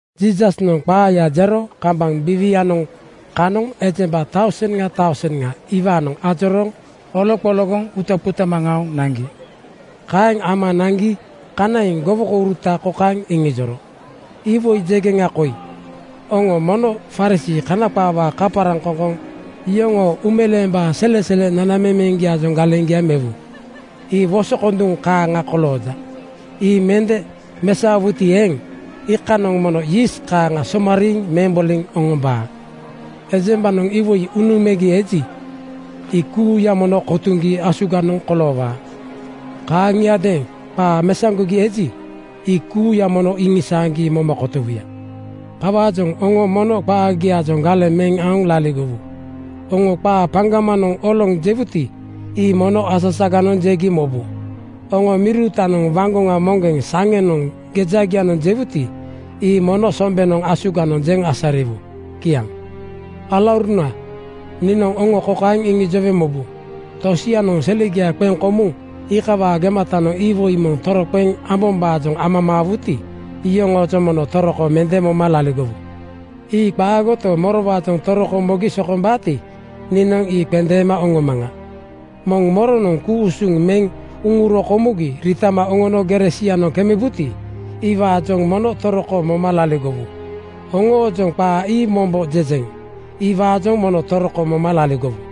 Jiisasnoŋ qaaya jero kambaŋ biiwianoŋ kanoŋ ejemba tauseŋa tauseŋa iwaanoŋ ajorooŋ oloqologoŋ utaqutama aoŋ naŋgi. Kaeŋ ama naŋgi kanaiŋ gowokouruta kokaeŋ iŋijoro, “Iwoi jegeŋa koi: Oŋo mono Farisii (Kana qaawaa kaparaŋkoŋkoŋ) yoŋoo uumeleembaa selesele nanamemeŋgiaajoŋ galeŋgia mewu. Ii wosokonduŋ kaaŋa kolooja. Ii mende mesaowuti eeŋ, iikanoŋ mono yiist kaaŋa somariiŋ meŋ boliŋ oŋombaa. “Ejembanoŋ iwoi unuŋ megi eji, ii kuuya mono kotuŋgi asuganoŋ koloowaa. Kaaŋiadeeŋ qaa mesaŋgogi eji, ii kuuya mono iŋisaaŋgi moma kotowuya. Kawaajoŋ oŋo mono qaagiaajoŋ galeŋ meŋ aoŋ laligowu. Oŋo qaa paŋgamanoŋ oloŋ jewuti, ii mono asasaganoŋ jegi mobu. Oŋo miri uutanoŋ waŋgoŋa moŋgeŋ saŋenoŋ gejagianoŋ jewuti, ii mono sombenoŋ asuganoŋ jeŋ asariwu.” Kiaŋ. “Alauruna niinoŋ oŋo kokaeŋ iŋijowe mobu: Tosianoŋ selegia qeŋ komuŋ iikawaa gematanoŋ iwoi moŋ toroqeŋ ambombaajoŋ amamaawuti, iyoŋoojoŋ mono toroko mende moma laligowu. Ii qaagoto, morowaajoŋ toroko mogi sokombaati, niinoŋ ii qendeema oŋomaŋa. Moŋ moronoŋ ku-usuŋ meŋ uŋuro komugi riitama oŋono gere sianoŋ kemebuti, iwaajoŋ mono toroko moma laligowu. Oŋoojoŋ qaa ii mombo jejeŋ: Iwaajoŋ mono toroko moma laligowu.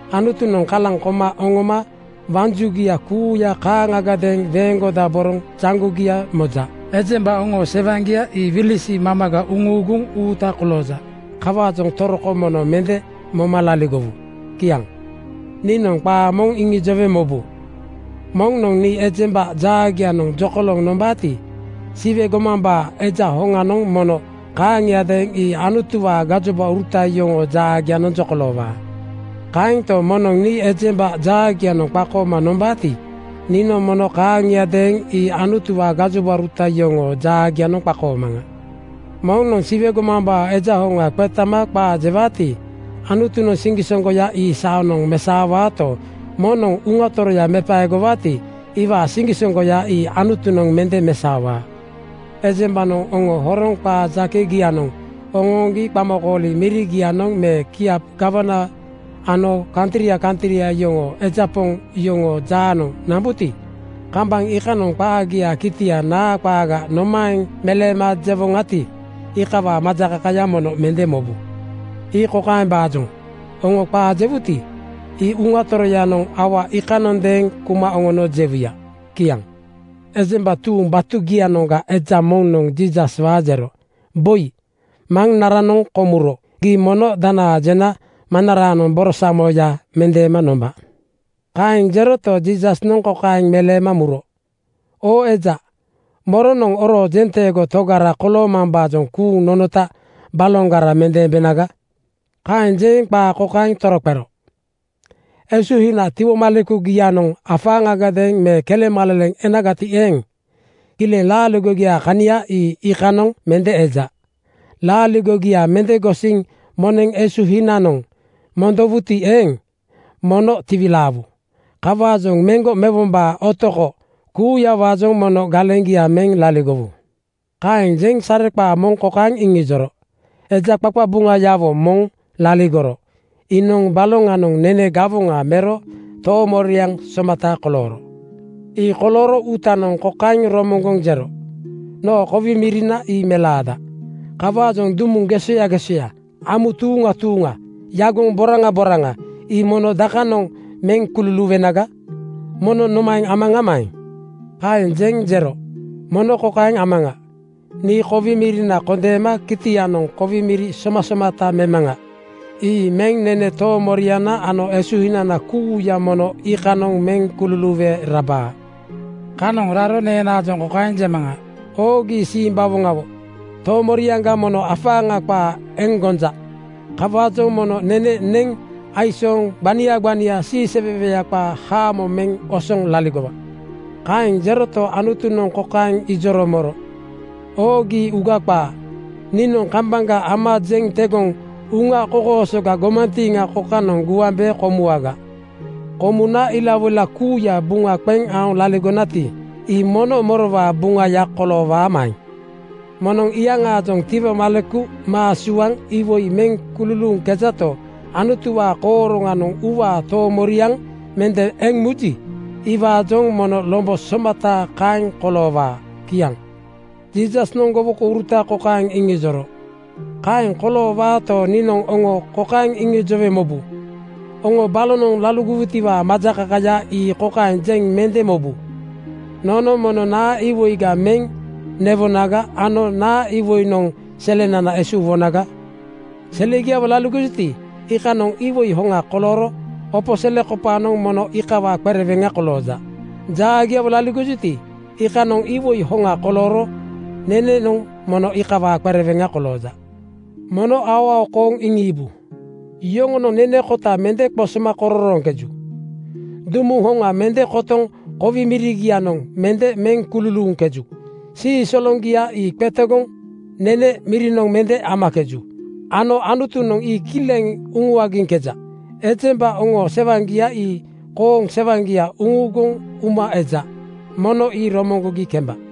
Anutunoŋ kalaŋ koma oŋoma waŋ jugia kuuya kaaŋagadeeŋ weeŋgodaboroŋ jaŋgogia moja. Ejemba oŋoo sewaŋgia ii wilisi mamaga uŋuuguŋ uuta kolooja. Kawaajoŋ toroko mono mende moma laligowu.” Kiaŋ. “Niinoŋ qaa moŋ iŋijowe mobu: Moŋnoŋ nii ejemba jaagianoŋ jokolooŋ nombaati, Siwe gomambaa Eja hoŋanoŋ mono kaaŋiadeeŋ ii Anutuwaa gajobauruta yoŋoo jaagianoŋ jokoloowaa. Kaento, moŋnoŋ nii ejemba jaagianoŋ qakooma nombaati, niinoŋ mono kaaŋiadeeŋ ii Anutuwaa gajobauruta yoŋoo jaagianoŋ qakoomaŋa. “Moŋnoŋ Siwe gomambaa Eja hoŋa qetama qaa jewaati, Anutunoŋ siŋgisoŋgoya ii saanoŋ mesaowaato, moŋnoŋ Uŋa Toroya mepaegowaati, iwaa siŋgisoŋgoya ii Anutunoŋ mende mesaowaa. “Ejembanoŋ oŋo horoŋ qaa jakegianoŋ oŋooŋgi qamakooli mirigianoŋ me kiap gawana ano kantria kantria yoŋoo eja poŋ yoŋoo jaanoŋ nambuti, kambaŋ iikanoŋ qaagiaa kitia naa qaaga nomaeŋ meleema jewoŋati, iikawaa majakakaya mono mende mobu. Ii kokaembaajoŋ: Oŋo qaa jewuti, ii Uŋa Toroyanoŋ aua iikanondeeŋ kuma oŋono jewuya.” Kiaŋ. Ejemba tuuŋ batugianoŋga eja moŋnoŋ Jiisaswaa jero, “Boi, maŋnaranoŋ komuro gii mono danaa jena maŋnaraanoŋ borosamoya mendeema nomba.” Kaeŋ jeroto, Jiisasnoŋ kokaeŋ meleema muro, “Oo eja, moronoŋ oroo jenteego togara koloomambaajoŋ kuuŋ nonota baloŋgara mendeembenaga?” Kaeŋ jeŋ qaa kokaeŋ toroqero, “Esuhina tiwomalekugianoŋ afaaŋagadeeŋ me kelemaleleŋ enagati eeŋ, kileŋ laaligogiaa kania ii iikanoŋ mende eja. Laaligogia mende gosiŋ moneŋ esuhinanoŋ mondowuti eeŋ, mono tiwilaawu. Kawaajoŋ meŋgo mewombaa otoko (greed) kuuyawaajoŋ mono galeŋgia meŋ laligowu.” Kaeŋ jeŋ sareqaa moŋ kokaeŋ iŋijoro, “Eja qaqabuŋayawo moŋ laligoro. Iinoŋ baloŋanoŋ nene gawoŋa mero toomoriaŋ somata kolooro. Ii kolooro uutanoŋ kokaeŋ romoŋgoŋ jero, ‘Noo kowi mirina ii melaada. Kawaajoŋ dumuŋ gesoya gesoya, amu tuuŋa tuuŋa, yagoŋ boraŋa boraŋa ii mono dakanoŋ meŋ kululuuwenaga? Mono nomaeŋ amaŋamaeŋ?’ Kaeŋ jeŋ jero, ‘Mono kokaeŋ amaŋa: Nii kowi mirina kondeema kitianoŋ kowi miri somasomata memaŋa. Ii meŋ nene toomoriana ano esuhinana kuuya mono iikanoŋ meŋ kululuuwe rabaa. Kanoŋ raro neenaajoŋ kokaeŋ jemaŋa: Oo gii simbawoŋawo! Toomoriaŋga mono afaaŋa qaa eŋ gonja. Kawaajoŋ mono nene neŋ aisooŋ gbania gbania siiseweweya qaa haamo meŋ osoŋ laligowa.’ Kaeŋ jeroto, Anutunoŋ kokaeŋ ijoro moro, ‘Oo gii, uuga qaa! Niinoŋ kambaŋga ama jeŋ tegoŋ uŋa kokoosoga gomantiiŋa kokanoŋ guambe komuwaga. Komuna ilawoila kuuya buŋa qeŋ aoŋ laligonati, ii mono morowaa buŋaya koloowaamaeŋ?’ “Moŋnoŋ iyaŋaajoŋ tiwomaleku maa suaŋ iwoi meŋ kululuuŋkejato, Anutuwaa kooroŋanoŋ uuwaa toomoriaŋa mende eŋ muji, iwaajoŋ mono lombo somata kaeŋ koloowaa.” Kiaŋ. Jiisasnoŋ gowokouruta kokaeŋ iŋijoro, “Kaeŋ koloowaato, niinoŋ oŋo kokaeŋ iŋijowe mobu: Oŋo balonoŋ laligowutiwaa majakakaya ii kokaeŋ jeŋ mende mobu: Nono mono naa iwoiga meŋ newonaga ano naa iwoinoŋ selenana esuuwonaga? Selegiawo laligojuti, iikanoŋ iwoi hoŋa kolooro opo selekopaanoŋ mono iikawaa qereweŋa kolooja. Jaagiawo laligojuti, iikanoŋ iwoi hoŋa kolooro nenenoŋ mono iikawaa qereweŋa kolooja. “Mono aoao kooŋ iŋiibu: Yoŋonoŋ nene kota mende qosoma kororooŋkeju. Dumuŋ hoŋa mende kotoŋ kowi mirigianoŋ mende meŋ kululuuŋkeju. Sii soloŋgia ii qetegoŋ (stua) nene mirinoŋ mende amakeju ano Anutunoŋ ii kileŋ uŋuagiŋkeja. Ejemba oŋoo sewaŋgia ii kooŋ sewaŋgia uŋuuguŋ uma eja. Mono ii romoŋgogi kemba.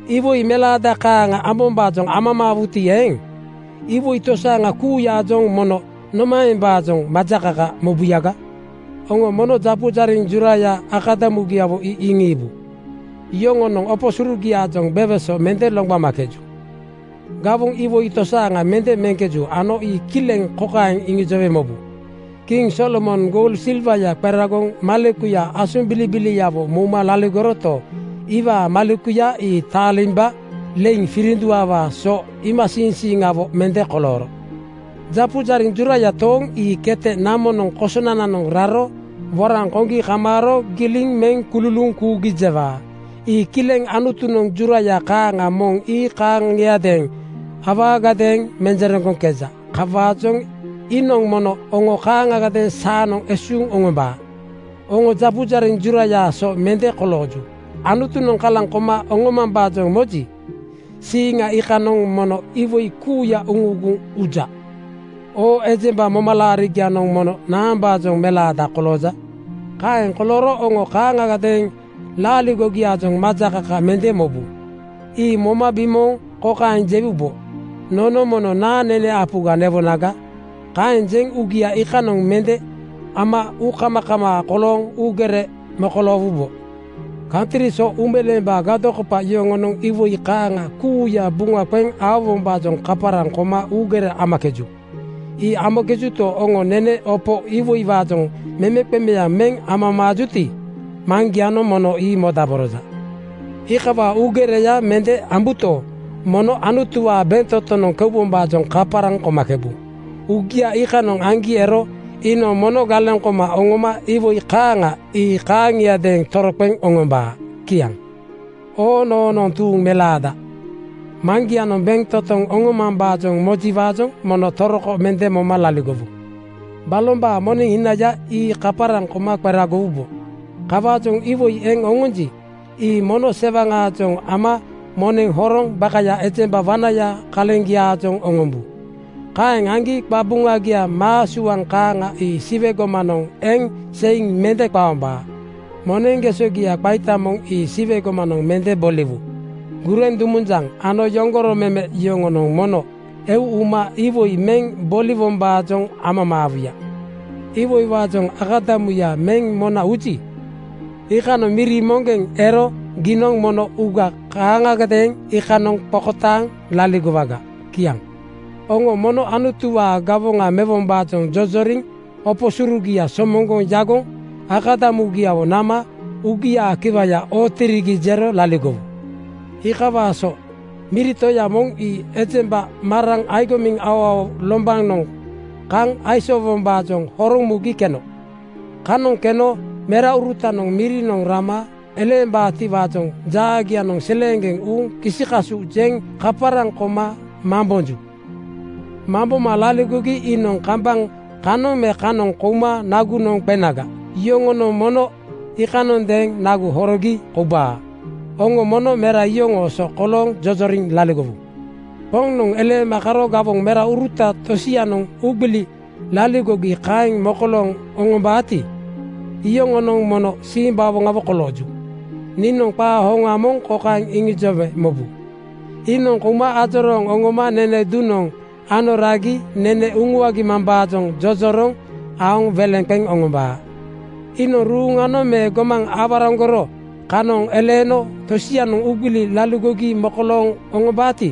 “Iwoi melaada kaaŋa ambombaajoŋ amamaawuti eeŋ, iwoi tosaaŋa kuuyaajoŋ mono nomaembaajoŋ majakaka mobuyaga? Oŋo mono japu jariŋ juraya akadamugiawo ii iŋiibu: Yoŋonoŋ opo surugiaajoŋ beweso mende loŋgbamakeju. Gawoŋ iwoi tosaaŋa mende meŋkeju ano ii kileŋ kokaeŋ iŋijowe mobu: Kiŋ Solomonoŋ goul silwaya qeragoŋ malekuya asombilibiliawo mouma laligoroto, iwaa malekuya ii taalimba leiŋ firinduawaa so iimasiiŋsiiŋawo mende kolooro. “Japu jariŋ juraya tooŋ ii kete namonoŋ kosonananoŋ raro woraŋ koŋgi kamaaro giliŋ meŋ kululuuŋ kuugi jewaa. Ii kileŋ Anutunoŋ juraya kaaŋa moŋ ii kaaŋiadeeŋ awaagadeeŋ menjereŋgoŋkeja. Kawaajoŋ iinoŋ mono oŋo kaaŋagadeeŋ saanoŋ esuuŋ oŋombaa. Oŋo japu jariŋ jurayaa so mende kolooju. Anutunoŋ kalaŋ koma oŋomambaajoŋ moji, siiŋa iikanoŋ mono iwoi kuuya uŋuuguŋ uja. Oo ejemba, momalaarigianoŋ mono naambaajoŋ melaada kolooja? “Kaeŋ kolooro oŋo kaaŋagadeeŋ laaligogiaajoŋ majakaka mende mobu. Ii moma bimooŋ kokaeŋ jewubo, ‘Nono mono naa nene apuga newonaga?’ Kaeŋ jeŋ uugia iikanoŋ mende ama uukamakamaa kolooŋ uugere mokoloowubo. Kantri so uumeleembaa gadokopa yoŋonoŋ iwoi kaaŋa kuuya buŋa qeŋ aowombaajoŋ kaparaŋ koma uugere amakeju. Ii amakejuto, oŋo nene opo iwoiwaajoŋ memeqemeaŋ meŋ amamaajuti, Maŋgianoŋ mono ii modaboroja. Iikawaa uugereya mende ambuto, mono Anutuwaa bentotonoŋ keubombaajoŋ kaparaŋ komakebu. Uugia iikanoŋ aŋgi ero iinoŋ mono galeŋ koma oŋoma iwoi kaaŋa ii kaaŋiadeeŋ toroqeŋ oŋombaa.” Kiaŋ. “Oo noonoŋ tuuŋ melaada, Maŋgianoŋ bentotoŋ oŋomambaajoŋ mojiwaajoŋ mono toroko mende moma laligowu. Balombaa moneŋ hinaya ii kaparaŋ koma qeragowubo. Kawaajoŋ iwoi eŋ oŋonji, ii mono sewaŋaajoŋ ama moneŋ horoŋ bakaya ejemba wanaya kaleŋgiaajoŋ oŋombu. Kaeŋ aŋgi qabuŋagia maa suaŋ kaaŋa ii Siwe gomanoŋ eŋ seiŋ mende qaombaa. Moneŋ gesogia qaita moŋ ii Siwe gomanoŋ mende boliwu. Gureŋ dumunjaŋ ano yoŋgoro meme yoŋonoŋ mono eu uma iwoi meŋ boliwombaajoŋ amamaawuya. “Iwoiwaajoŋ akadamuya meŋ mona uji, iikanoŋ miri moŋgeŋ ero giinoŋ mono uuga kaaŋagadeeŋ iikanoŋ qokotaaŋ laligowaga.” Kiaŋ. “Oŋo mono Anutuwaa gawoŋa mewombaajoŋ jojoriŋ opo surugia somoŋgoŋ yagoŋ akadamugiawo nama uugiaa kiwayanoŋ ootirigi jero laligowu. Ii kokawaa so: Miri toya moŋ ii ejemba maraŋ (agomiŋ aoao) lombanoŋ kaŋ aisoowombaajoŋ horoŋ mugi keno. Kanoŋ keno meraurutanoŋ mirinoŋ rama eleembaatiwaajoŋ jaagianoŋ seleeŋgeŋ uuŋ kisi-kasu jeŋ kaparaŋ koma mambonju. Mamboma laligogi iinoŋ kambaŋ kanoŋ me kanoŋ kouma nagunoŋ qenaga, yoŋonoŋ mono iikanondeeŋ nagu horogi koubaa. Oŋo mono mera iyoŋoo so kolooŋ jojoriŋ laligowu. “Poŋnoŋ eleema karo gawoŋ memeuruta tosianoŋ uugbili laligogi kaeŋ mokolooŋ oŋombaati, iyoŋonoŋ mono simbawoŋawo kolooju. Niinoŋ qaa hoŋa moŋ kokaeŋ iŋijowe mobu: Iinoŋ kouma ajorooŋ oŋoma nene duŋnoŋ ano ragi nene uŋuagi mambaajoŋ jojoroŋ aoŋ weleŋ qeŋ oŋombaa. Iinoŋ ruuŋanoŋ me gomaŋ aworaŋgoro kanoŋ eleeno tosianoŋ uugbili laligogi mokolooŋ oŋombaati,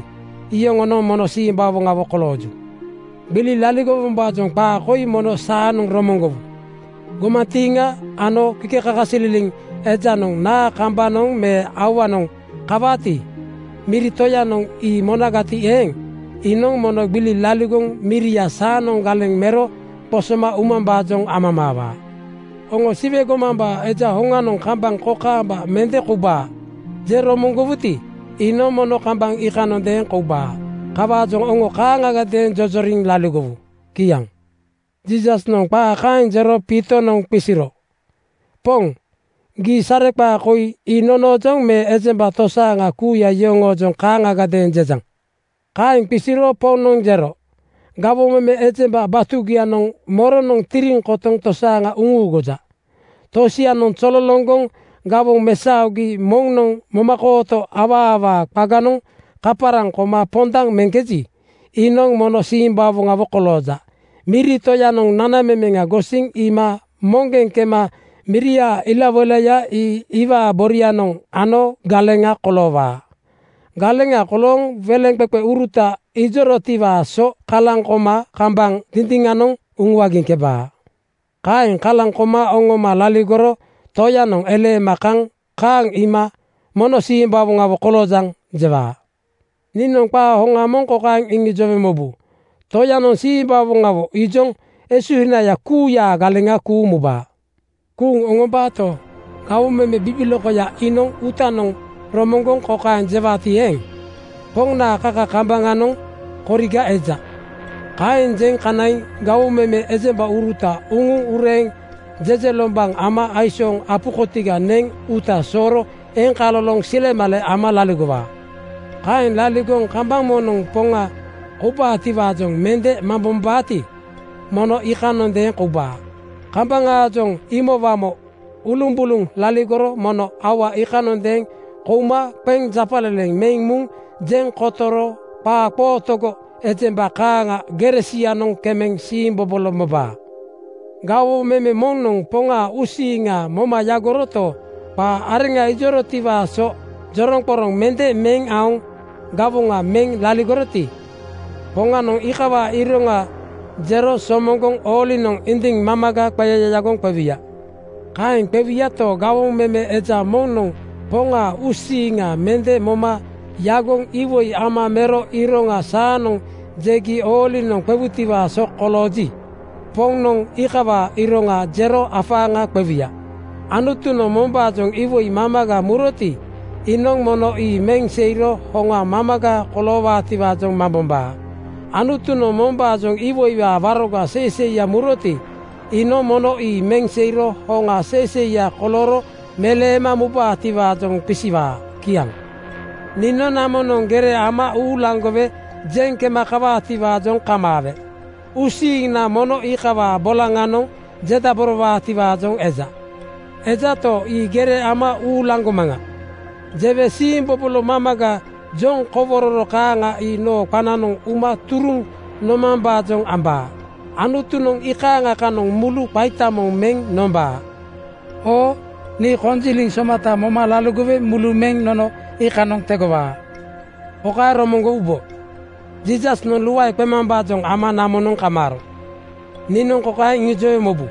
iyoŋonoŋ mono simbawoŋawo kolooju. “Gbili laligowombaajoŋ qaa koi mono saanoŋ romoŋgowu: gomantiiŋa ano kikekakasililiŋ ejanoŋ naa kambanoŋ me auanoŋ kawaati, miri toyanoŋ ii monagati eeŋ, iinoŋ mono gbili laligoŋ miria saanoŋ galeŋ mero qosoma umambaajoŋ amamaawaa. Oŋo ‘Siwe gomambaa Eja hoŋanoŋ kambaŋ kokaamba mende koubaa,’ jeŋ romoŋgowuti, iinoŋ mono kambaŋ iikanondeeŋ koubaa. Kawaajoŋ oŋo kaaŋagadeeŋ jojoriŋ laligowu.” Kiaŋ. Jiisasnoŋ qaa kaeŋ jero Piitonoŋ qisiro, “Poŋ, gii sareqaa koi ii nonoojoŋ me ejemba tosaaŋa kuuya yoŋoojoŋ kaaŋgadeeŋ jejaŋ?” Kaeŋ qisiro Poŋnoŋ jero, “Gawoŋ meme ejemba batugianoŋ moronoŋ tiriŋ kotoŋ tosaaŋa uŋuuguja? Tosianoŋ zololoŋgoŋ gawoŋ mesaogi moŋnoŋ momakooto awaawaa qaganoŋ kaparaŋ koma pondaŋ meŋkeji, iinoŋ mono simbawoŋawo kolooja. Miri toyanoŋ nanamemeŋa gosiŋ iima moŋgeŋ kema miriaa ilawoilaya ii iwaa borianoŋ ano galeŋa koloowaa. Galeŋa kolooŋ weleŋqeqeuruta ijorotiwaa so kalaŋ koma kambaŋ dindiŋanoŋ uŋuagiŋkebaa. Kaeŋ kalaŋ koma oŋoma laligoro toyanoŋ eleema kaŋ kaaŋ iima ‘Mono simbawoŋawo koloojaŋ!’ jewaa. “Niinoŋ qaa hoŋa moŋ kokaeŋ iŋijowe mobu: Toyanoŋ simbawoŋawo ijoŋ esuhinaya kuuyaa galeŋa kuuŋ mubaa. Kuuŋ mubaato, gawoŋ meme bibilokoya iinoŋ uutanoŋ romoŋgoŋ kokaeŋ jewaati eeŋ, ‘Poŋnaa kaka kambaŋanoŋ koriga eja.’ Kaeŋ jeŋ kanaiŋ gawoŋ meme ejembauruta uŋuŋ ureeŋ jejelombaŋ ama aisooŋ apu kotiga neŋ uuta sooro eŋkaloloŋ silemale ama laligowaa. Kaeŋ laligoŋ kambaŋ moŋnoŋ Poŋa koubaatiwaajoŋ mende mambombaati, mono iikanondeeŋ koubaa. Kambaŋaajoŋ imowamo ulumbuluŋ laligoro mono aua iikanondeeŋ kouma qeŋ japaleleŋ meŋ muŋ jeŋ kotoro qaaqootogo ejemba kaaŋa gere sianoŋ kemeŋ siimbobolo mobaa. “Gawoŋ meme moŋnoŋ Poŋaa uusiiŋa moma yagoroto, qaa areŋa ijorotiwaa so joroŋqoroŋ mende meŋ aoŋ gawoŋa meŋ laligoroti, Poŋanoŋ iikawaa iroŋa jero somoŋgoŋ oolinoŋ indiŋ mamaga qeyayagoŋ qewuya. Kaeŋ qewuyato, gawoŋ meme eja moŋnoŋ Poŋaa uusiiŋa mende moma yagoŋ iwoi ama mero iroŋa saanoŋ jegi oolinoŋ qewutiwaa so kolooji, Poŋnoŋ iikawaa iroŋa jero afaaŋa qewuya. Anutunoŋ mombaajoŋ iwoi mamaga muroti, iinoŋ mono ii meŋ seiro hoŋa mamaga koloowaatiwaajoŋ mambombaa. Anutunoŋ mombaajoŋ iwoiwaa waroga seiseiya muroti, iinoŋ mono ii meŋ seiro hoŋa seiseiya kolooro meleema mubaatiwaajoŋ qisiwaa.” Kiaŋ. “Niinoŋ namonoŋ gere ama uulaŋgowe jeŋ kema kawaatiwaajoŋ kamaawe uusiiŋna mono iikawaa bolaŋanoŋ jedaborowaatiwaajoŋ eja. Ejato, ii ‘Gere ama uulaŋgomaŋa,’ jewe siimbobolo mamaga joŋ kowororo kaaŋa ii noo qananoŋ uma turuŋ nomambaajoŋ ambaa. Anutunoŋ iikaaŋa kanoŋ mulu qaita moŋ meŋ nombaa. Oo nii konjiliŋ somata moma laligowe mulu meŋ nono iikanoŋ tegowaa. Kokaeŋ romoŋgowubo: Jiisasnoŋ luae qemambaajoŋ ama namonoŋ kamaaro. Niinoŋ kokaeŋ iŋijowe mobu: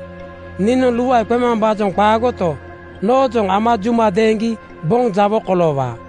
Niinoŋ luae qemambaajoŋ qaagoto, noojoŋ ama juma deeŋgi boŋ jawo koloowaa.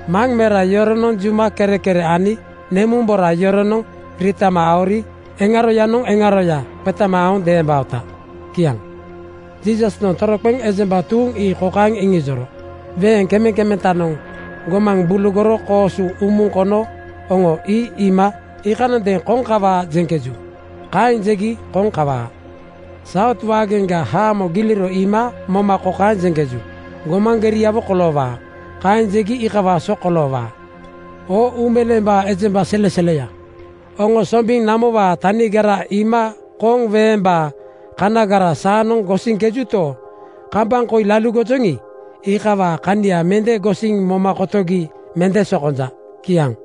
Maŋmera yoronoŋ juma kerekere ani nemumbora yoronoŋ riitama aori eŋaroyanoŋ eŋaroya qetama aoŋ deembaota.” Kiaŋ. Jiisasnoŋ toroqeŋ ejemba tuuŋ ii kokaeŋ iŋijoro, “Weeŋ kemekemetanoŋ gomaŋ bulugoŋ koosu umuŋ kono oŋo ii iima iikanondeeŋ ‘Koŋ kawaa,’ jeŋkeju. Kaeŋ jegi koŋ kawaa. Saut waageŋga haamo giliro iima moma kokaeŋ jeŋkeju, ‘Gomaŋ geriawo koloowaa.’ Kaeŋ jegi iikawaa so koloowaa. Oo uumeleembaa ejemba seleseleya, oŋo sombiŋ namowaa tanigara iima koŋ weembaa kanagara saanoŋ gosiŋkejuto, kambaŋ koi laligojoŋi, iikawaa kania mende gosiŋ moma kotogi mende sokonja.” Kiaŋ.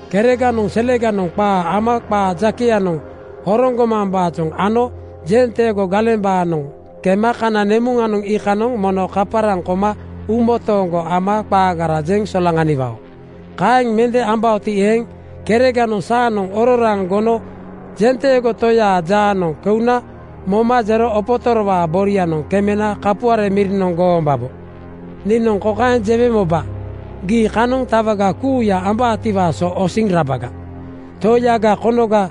Kereganoŋ seleganoŋ qaa ama qaa jakeyanoŋ horoŋ gomambaajoŋ ano jenteego galembaanoŋ kema kana nemuŋanoŋ iikanoŋ mono kaparaŋ koma uumotooŋgo ama qaagara jeŋ solaŋaniwao. Kaeŋ mende ambaoti eeŋ, kereganoŋ saanoŋ ororaaŋ gono (jas, majistreit) jenteego toyaa jaanoŋ keuna moma jero opotorowaa borianoŋ kemena kapuare mirinoŋ goombabo. Niinoŋ kokaeŋ jewe moba, Gii kanoŋ tawaga kuuya ambaatiwaa so osiŋ rabaga. Toiyaga konoga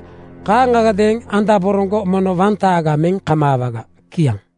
kaaŋagadeeŋ andaboroŋgo mono wantaaga meŋ kamaawaga.” Kiaŋ.